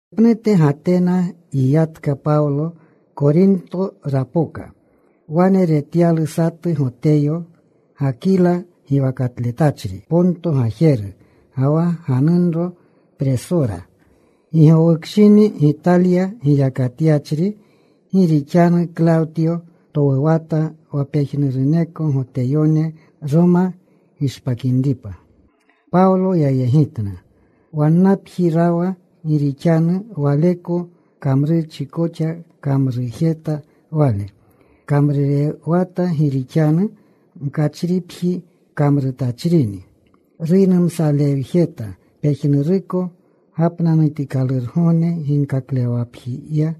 Wanepnute Gatena yiyatka Pawlo. Korinto rapoka. Wane retyalu satu Goteyo, Gakila giwakatletachri, Ponto gajeru, ga wa ganunro Presura. Gi gowukshini Gitalya giyakatyachri. Gi rixanu Klawtyo towuwata wa pejnuruneko Goteyone Roma gishpakinripa. Pawlo yayegitna. Wannapji rawa gi rixanu waleko kamrurchi koxa kamrujeta wale. Kamrurewata. Gi rixanu mkachripji kamrutachinni. Ruynumsalewjeta pejnuruko gapnanutikalurgogne ginkaklewwakapjiya.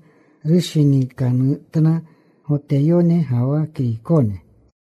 Rushinikanutna Goteyone ga wa Kriykone.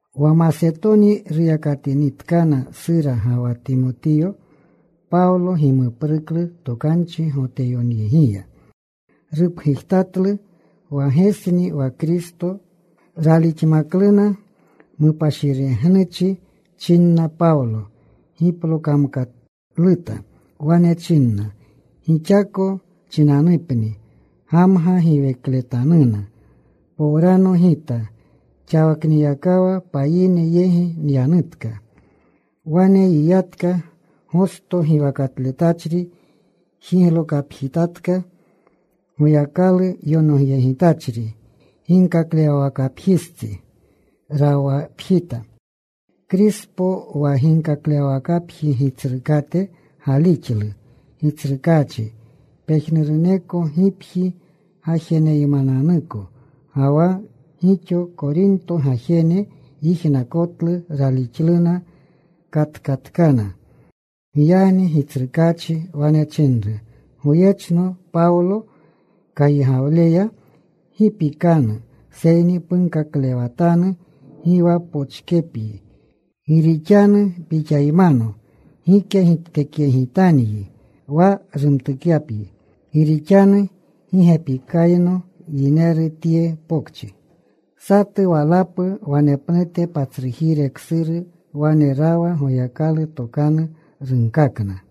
Wa Masetoni ruyakatinitkana Sura ga wa Timotiyo, Pawlo gimupruklu tokanchi. Goteyoneyegiya rupgujtatlu wa Gesni wa Kristo. Raalixmakluna. Mupashiregnuchi chinna. Pawlo giplokamkaluta. Wane chinna, “Gixako chinanupni gamga giwekletanuna. Powrano gita. Xaniyakawa payine yegi nyanutka.” Wane yiyatka. Gosto giwakatletachri jiglokapjitatka. Goyakalu yonogyegitachri. Ginkaklewwakapjistsi rawapjita. Krispo wa ginkaklewwakapji gitsrukate galixlu Gitsrukaachi, pejnuruneko gipji gajeneymananuko. Ga wa gixo Korintyo gajene yijnakotlu. Ralixluna. Katkatkana. Giyagni Gitsrukaachi wane chinru goyechno Pawlo kaygawleya, “Gi pikanu. Seyni punkaklewatanu. Gi wa pochkepyi. Gi rixanu pixaymano. Gike giptekyegitanyi wa rumtukyapyi. Gi rixanu gi gepikayno yineru tye pokchi.” Satu walapu wanepnute patsrujire ksuru wane rawa. Goyakalu tokanu runkakna.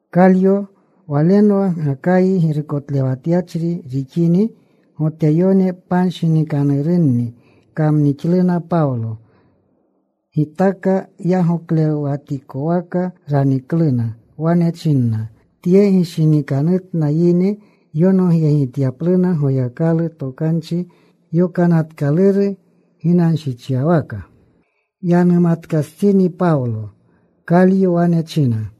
Kalyo walenwa Gakayi girukotlewatyachri rixini Goteyone panshinikanurunni kamnixluna Pawlo. Gitaka yagoklewjetikowaka ranikluna. Wane chinna, “Tye gishinikanutna yine yonogyegityapluna Goyakalu, Tokanchi Yokanatkaluru ginanshichyawaka.” Yanumatkastsini Pawlo, Kalyo wane chinna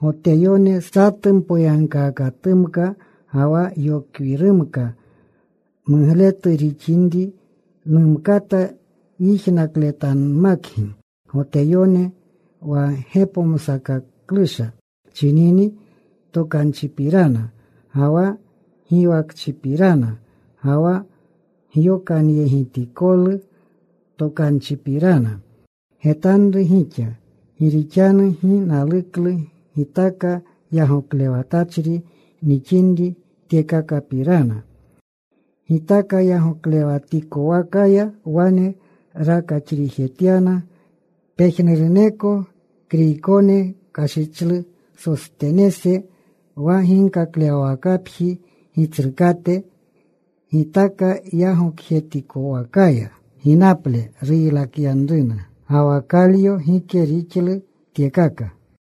Goteyone, “Satu mpoyagkaakatumka ga wa yokwirumka mugletu rixinri, numkata yijnakletanmakgi, Goteyone. Wa gepomsakaklusha chinini tokanchipirana, ga wa giwakchipirana, ga wa Gyokanyegitikolu Tokanchipirana, getanru gixa. Gi rixanu gi naluklu gitaka yagoklewatachri nixinri tyekakapirana.” Gitaka yagokjetikwakaya wane rakaxrijetyana. Pejnuruneko Kriykone kashichlu Sostenese wa ginkaklewwakapji gitsrukate. Gitaka yagokjetikowakaya ginaple ruylakyanruna. Ga wa Kalyo gike rixlu tyekaka.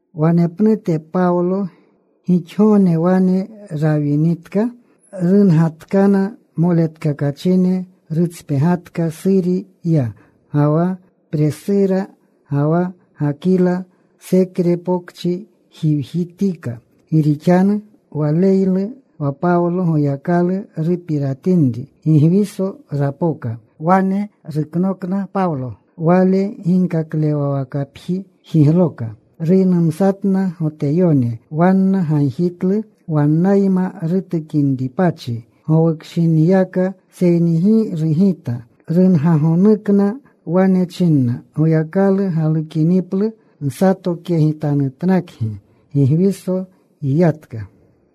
Wanepnute Pawlo gixgogne wane rawinitka, rungatkana moletkakachine. Rutspegatka. Suri ya, ga wa Presura ga wa Gakila. Senkre Pokchi jiwjitika, gi rixanu waneylu wa Pawlo Goyakalu rupiratinri. Gigwiso rapoka. Wane ruknokna Pawlo. Wale ginkaklewawakapji jigloka. Ruynumsatna Goteyone. Wanna gagjitlu wannayma rutukinripachi gowukshiniyaka. Seyni gi rugita. Rungagonukna. Wane china, “Goyakalu galukiniplu nsatokyegitanutnakgi.” Gigwiso yiyatka.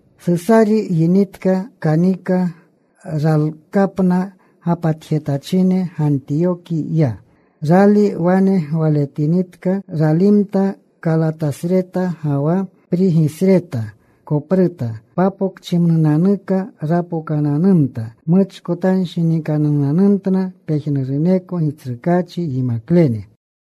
Susari yinitka. Kanika. Ralkapna gapatjetachine. Gantiyoki ya. Rali wane gwaletinitka ralimta. Kalatasreta ga wa Prigisreta kopruta. Papokchimnunanuka rapokananumta. Muchkotanshinikanunanumtna pejnuruneko Gitsrukaachi yimaklene.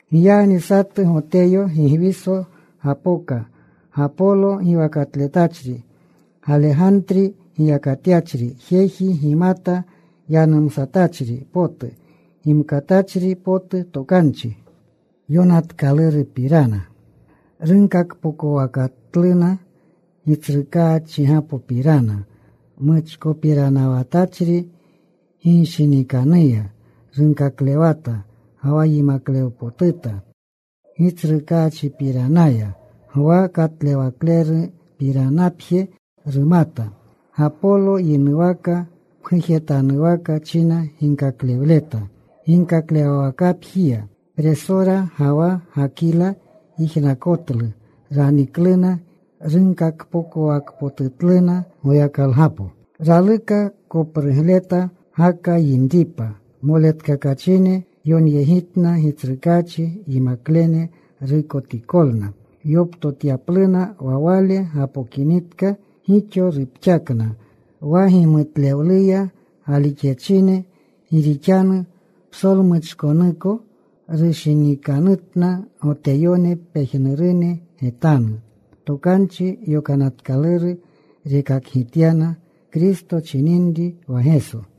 Giyagni satu Goteyo Gigwiso gapoka, Gapolo giwakatletachri, Galegantri giyakatyachri, jeji gimata yanumsatachri potu, gimkatachri potu Tokanchi Yonatkalurupirana. Runkakpokowakatluna Gitsrukaachgapopirana. Muchkopiranawatachri ginshinikanuya. Runkaklewata ga wa yimaklewpotuta Gitsrukaachipiranaya. Gwa katlewlepiranapje rumata. Gapolo yinuwaka pgujetanwaka china ginkaklewleta ginkaklewwakapjiya. Presura ga wa Gakila yijnakotlu. Ranikluna. Runkakpokowakpotutluna Goyakalgapo. Raluka koprugleta, Gaka yinripa. Moletkakachine yonyegitna Gitsrukaachi yimaklene. Ruykotikolna yoptotyapluna. Wa wale gapokinitka, gixo rupxakna wa gimutlewluya galixyachine. Gi rixanu psolmuchkonuko rushinikanutna Goteyone pejnurune getanu. Tokanchi Yonatkaluru rekakgityana Kristo chininri wa Geso.